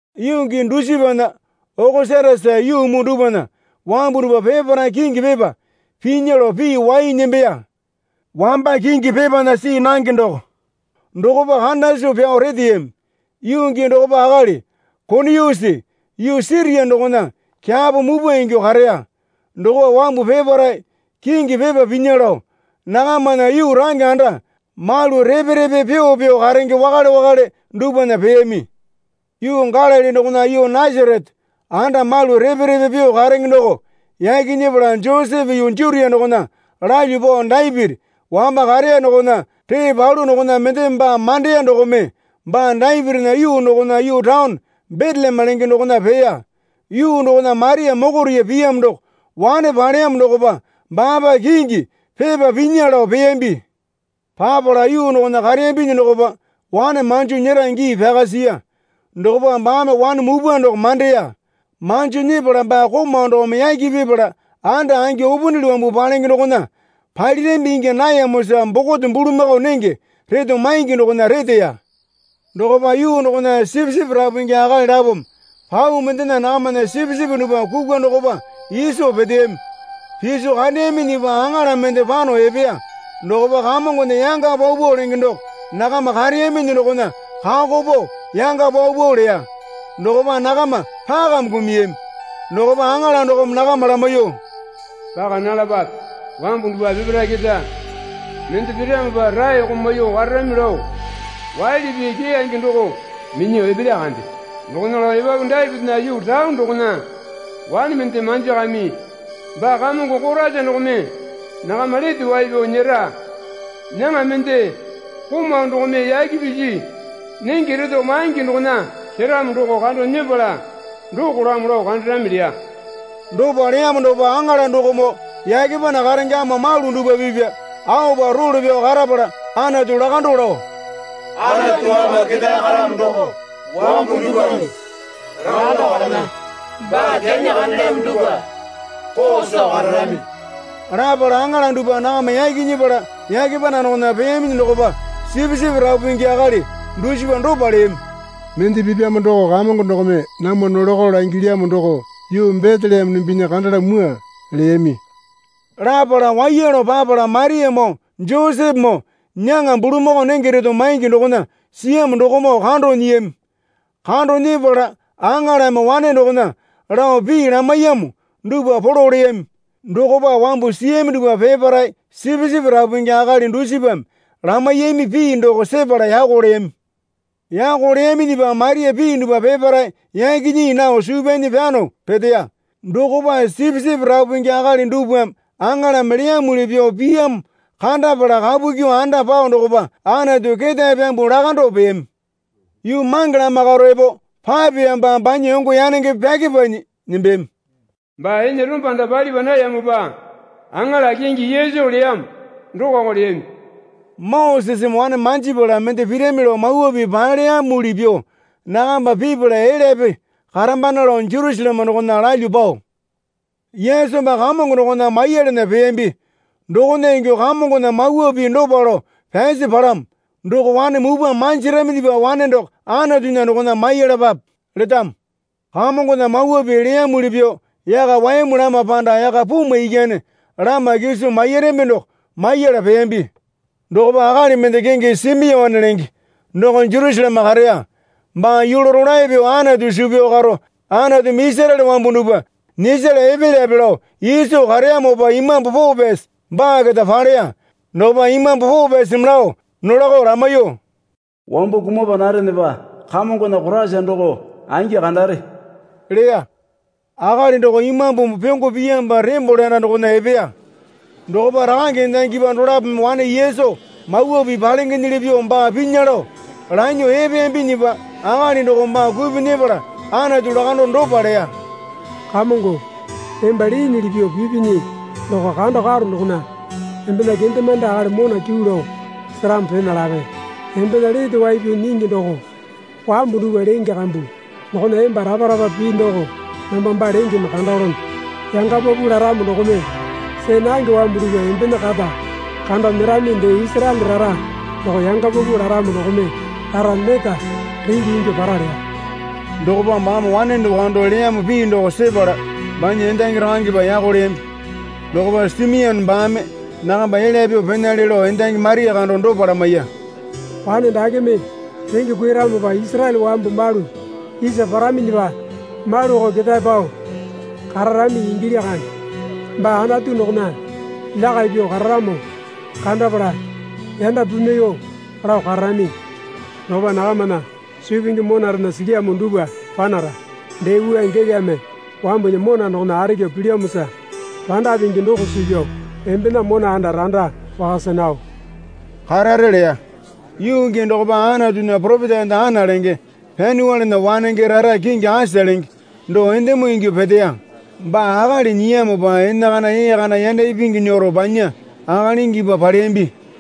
Yuu gii dusipana Okosatasa yuu muu dupwana wambu dupwa peparae kingi pepa pinya lao pii wai nembeya. Wamba kingi pepana see nange doko dokopa kanda soo pyao reteyami. Yuu gii dokopa akali Kuiniyusi yuu Siria dokona kyapo mupwa ingyuo kareya. Dokopa wambu peparae kingi pepa pinya lao nakamana yuu range anda malu repe repe pyuo pyuo karenge wakale wakale dupwana peyami. Yuu Galili dokona yuu Nasarete anda malu repe repe pyuo karenge doko yaki nyepala Josepe yuu Jutia dokona lalyuo pao Dapiti wamba kareya dokona ree palu dokona mendeme baa mandeya dokome baa Dapitinya yuu dokona yuu taone Beteleme lenge dokona peya. Yuu dokona Maria mokoriya piyamo doko wane paleyamo dokopa baapa kingi pepa pinya lao peyambi. Papala yuu dokona kareyambinyi dokopa wane manjo nyera gii pyaka siya. Dokopa baame wane mupwa doko mandeya. Manjo nyepala baa komau dokome yaki pipala anda angi upunili wambu palenge dokona palirambi ingya nayamosa bokote bulamakao nenge reto maingi dokona reteya. Dokopa yuu dokona sipisipi rapu pingi akali lapome pau mendena nakamana sipisipi dupwa kukwa dokopa iso peteyami. Piso kandeyaminyipa aŋala mende pano epeya. Dokopa Kamongona yanga paupau lenge doko nakama kareyaminyi dokona kako pao yanga paupau leya. Dokopa nakama pakame kumuyami. Dokopa aŋala dokome nakama lamaiyuo, Paka nalapape. Wambu dupwa peparae keta mende piramopa raeko maiyuo kararami lao waili pii keyange doko minyuo epelya kande. Dokona lao epapu Dapitinya yuu taone dokona wane mende manjakami. Baa Kamongo Koraisa dokome nakama lete wai pyao nyera. Nyaŋa mende komau dokome yaki pisi nenge reto maingi dokona seramo doko kando nyepala dokolamo lao kandarami, leya. Dopa leyamo dokopa aŋala dokomoo yake panda karenge ama malu dupwa pipya aopa role pyao karapala Anatu lakando lao, Anatu ama ketae karamo doko wambu dupwame lakando karena, baa kyanyi kandelyamo dupwa koo soo kararami. Lapala aŋala dupwa nakama yaki nyepala yake panda dokona peyaminyi dokopa sipisipi rapu pingi akali dusipa dopa leyami. Mende pipyamo doko Kamongo dokome namwa nolako langilyamo doko yuu Beteleme dumbinya kandala mwua, leyami. Lapala waiya lao papala Mariamoo Josepemoo nyaŋa bulamakao nenge reto maingi dokona siyamo dokomoo kando nyiyami. Kando nyepala aŋalame wane dokona lao pii lamaiyamo dupwa polo leyami. Dokopa wambu siyami dupwa peparae sipisipi rapu pingi akali dusipame lamaiyami pii doko sepala yako leyami. Yako leyaminyipa Maria pii dupwa peparae yaki nyii nao suu pyanyi pyano peteya. Dokopa sipisipi rapu pingi akali dupwame aŋalame leyamuli pyuo piyamo kandapala kapu kyuo anda pao dokopa Anatu ketae pyambuo lakando peyami. Yuu mange lama karo epo papeyamopa banya yongo yanenge pyakepanyi nembeyami. Baa ene rombanda palipa nayamopa aŋala kingi Yesu leyamo dokoko leyami. Moseseme wane manjipala mende pirami lao Mawa Pii paleyamuli pyuo nakamba pipala elyape karambana lao Jerusaleme dokona lalyuo pao Yesu baa Kamongo dokona maiyalana peyambi. Dokona ingyuo Kamongona mawa pii dopa lao pyasi palamo. Doko wane mupwa manjiraminyipa wane doko Anatunya dokona maiyalapape letamo. Kamongona mawa pii leyamuli pyuo yaka wayamu lama panda yaka pumwa ikyane lama kiso mairami doko maiyala peyambi. Dokopa akali mende kingi Simione lenge doko Jerusaleme kareya. Baa yulu rolae pyuo Anatu suu pyao karo Anatumi Isaraele wambu dupwa nyisala epelyape lao iso kareyamopa Imambu Poo Pyasi baa keta paleya. Dokopa Imambu Poo Pyasimi lao nolako lamaiyuo, Wambo kumapa narenepa Kamongona Koraisa doko angi kandare, leya. Akali doko Imambumi pyongo piyamopa tembole anda dokona epeya. Dokopa rakange endangipa dolapome wane Yesu Mawa Pii palengenyili pyuo baa pinya lao lanyuo epeyambinyipa akali dokome baa kupyuo nyepala Anatu lakando dopa leya. Kamongo, emba leenyili pyuo pipinyi doko kando karo dokona embena kendemande akali mona kyuu lao seramo pena lape. Embena lete wai pyao nyingi doko wambu dupwa lenge kambu dokona emba rapa rapa pii doko namba baa lengeme kandalono. Yanga paupau laramo dokome see nange wambu dupwa embena kata kando nyerami dee Isaraele rara doko yanga paupau laramo dokome rara neta renge ingyuo para leya. Dokopa baame wane doko kando leyamo pii doko sepala banya endangi rakangepa yako leyambi. Dokopa Simione baame nakamba elya pyuo penale lao endangi Maria kando dopa lamaiya. Wane dakeme renge kuiramopa Isaraele wambu malu isa paraminyipa maluko ketae pao kararami ingilya kande. Baa Anatu dokona lyakai pyuo kararamo kandapala yanda pimwaiyuo lao kararami. Dokopa nakamana suu pingi monarena silyamo dupwa panara. Dee wua gelame wambunya mona dokona arekyu pilyamosa randa pingi doko suu pyao embena mona anda randa wakasa nao karare leya. Yuu gii dokopa Anatunya poropeta enda Ana lenge Panyuelena wanenge rara kingi Asa lenge doko endemo ingyuo peteya. Baa akali nyiyamopa enakana ee kana yanda ipingi nyero banya akalingipa paleyambi.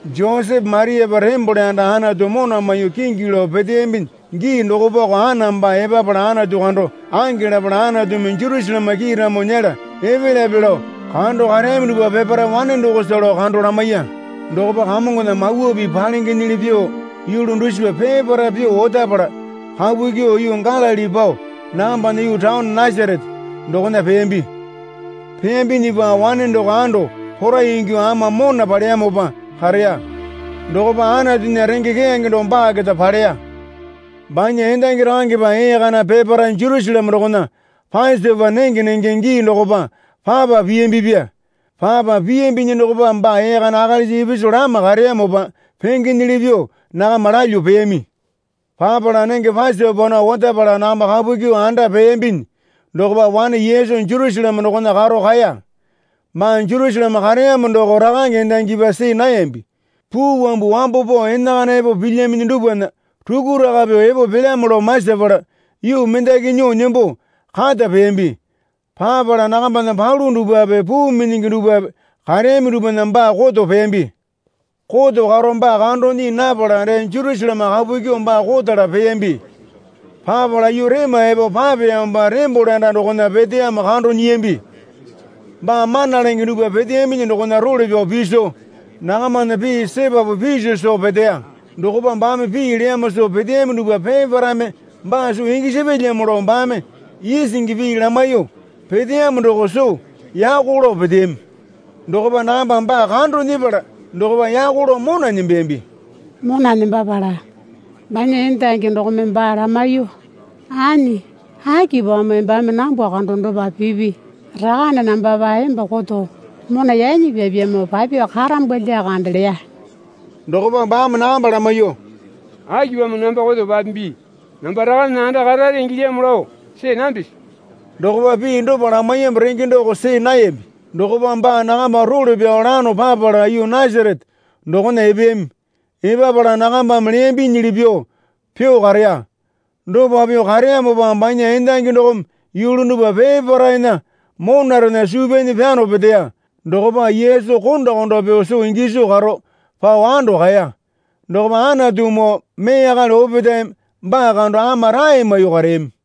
Josepe Mariapa tembole anda Anatu mona maiyuo kingi lao peteyambinyi gii dokopako Ana baa epapala Anatu kando ange lapala Anatumi Jerusaleme kiiramo nyela epelyape lao kando kareyami dupwa peparae wane dokosa lao kando lamaiya. Dokopa Kamongona mawa pii palengenyili pyuo yulu dusipa peparae pyuo otapala kapu kyuo yuu Galili pao nakambana yuu taone Nasarete dokona peyambi. Peyambinyipa wane doko ando porai ingyuo ama mona paleyamopa kareya. Dokopa Anatunya renge keyange doko baa keta paleya. Banya endangi rakangepa ee kana peparae Jerusaleme dokona Pasopa nenge nenge gii dokopa papa piyambipya. Papa piyambinyi dokopa baa ee kana akalisa ipisu lama kareyamopa pengenyili pyuo nakama lalyuo peyami. Papala nenge Pasopa nao otapala nakamba kapu kyuo anda peyambinyi dokopa wane Yesu Jerusaleme dokona karo kaeya. Baa Jerusaleme kareyamo doko rakange endangipa see nayambi. Puu wambu wambo pao enakana epo pilyaminyi dupwana rukuraka pyuo epo pelyamo lao masapala yuu mendaki nyuo nembo kata peyambi. Papala nakambana palu dupwape puu minyingi dupwape kareyami dupwana baa koto peyambi. Koto karo baa kando nyii napala dee Jerusaleme kapu kyuo baa kotala peyambi. Papala yuu rema epo papeyamopa tembole anda dokona peteyamo kando nyiyambi. Baa mana lenge dupwa peteyaminyi dokona role pyao piso nakamana pii sepapu piso soo peteya. Dokopa baame pii leyamo soo peteyami dupwa peparaeme baa soo gisapyalyamo lao baame isingi pii lamaiyuo peteyamo doko soo yako lao peteyami. Dokopa nakambame baa kando nyepala dokopa yako lao mona nembeyambi. Mona nembapala banya endangi dokome baa lamaiyuo, Anyi, akipamo embame nambwa kando dopa pipi? Rakane nambapa emba koto mona yanyi pyapyamo papyuo karambwa lyakande, leya. Dokopa baame nakamba lamaiyuo, Akipamo namba koto papimbi? Namba Rakanena anda karare ingilyamo lao see nambisi? Dokopa pii dopa lamaiyamo renge doko see nayambi. Dokopa baa nakamba role pyao lano papala yuu Nasarete dokona epeyami. Epapala nakambame leyambinyili pyuo pyuo kareya. Dopa pyuo kareyamopa banya endangi dokome yulu dupwa peparaena monarena suu pyanyi pyano peteya. Dokopa Yesu konda konda pyuo soo giso karo pao ando kaeya. Dokopa Anatumoo mee akali opetaeme baa kando ama rae maiyuo kareyami.